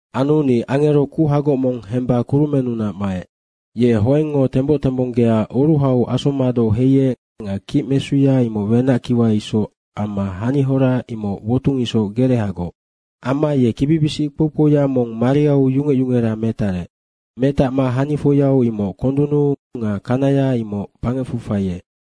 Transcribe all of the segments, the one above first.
Anu ni angero kuhagoc mong hemba kurumennunac maec. Ye hoengngo temboc tembonggea oruhau asommadoc heiec nga kicmesuya imoc wenackiwa isoc amma hanihora imoc wotung isoc gerehagoc. Amma ye kibibisic kpou kpouya mong mariau yungec yungera metarec. Metacma hanifoia imoc kondunnu nga kanaya imoc bangecfu faiec.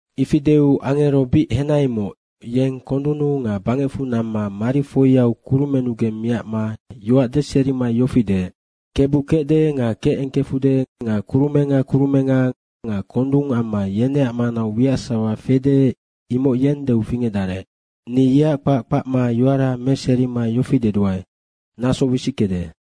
Ifi deu angero bic henaimoc, yeng kondunnu nga bangecfu namma marifoia kurumennugeng miacma yoac deserima yofi deec, “Kebu kecde nga kecengkefude nga kurumenga kurumenga nga kondung amma yeneac manau wiac sasawa fede, imoc yeng deu fingecdarec, ni yeac kpac kpacma yoara meserima yofi deduae, ‘Naso wisickede.’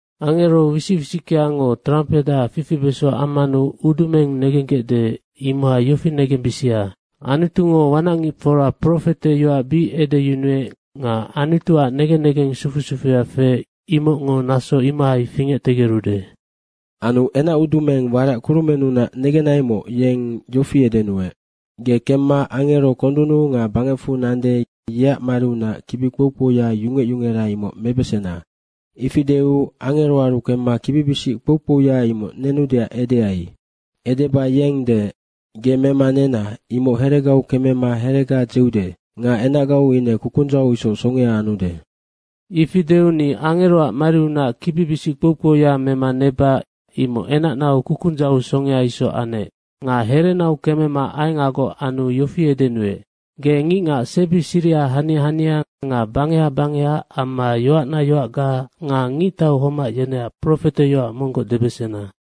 Angero wisic wisickeango trampeha fifibeso ammanu udumeng negenggecde, imohai yofi negembisia. Anutungo wanacngicfora profete yoac bic edeyunuec nga Anutuac negen negeng sufu sufuya feec, imocngo naso imohai fingectegerude.” Anu enacudumeng warac kurumennunac negenaimoc, yeng yofi edenuec, “Ge kemma angero kondunnu nga bangecfu nande, yeac mariunac kibi kpou kpouya yungec yungera, imoc mebesena.” Ifi deu angeroaru kemma kibibisic kpou kpouya imoc nenudeac edeai. Edeba yeng deec, “Ge mema nena imoc heregau kemema herega dzeude nga enacgau ine kukundzau isoc songea anude.” Ifi deu ni angeroac mariunac kibibisic kpou kpouya mema neba imoc enacnau kukundzau isoc songea anec. Nga herenau kemema aengagoc anu yofi edenuec, “Ge ngicngac sebi siriha hania hania nga bangeha bangeha amma yoacna yoacga nga ngictau homac yeneac profeteyoac monggoc debesena.”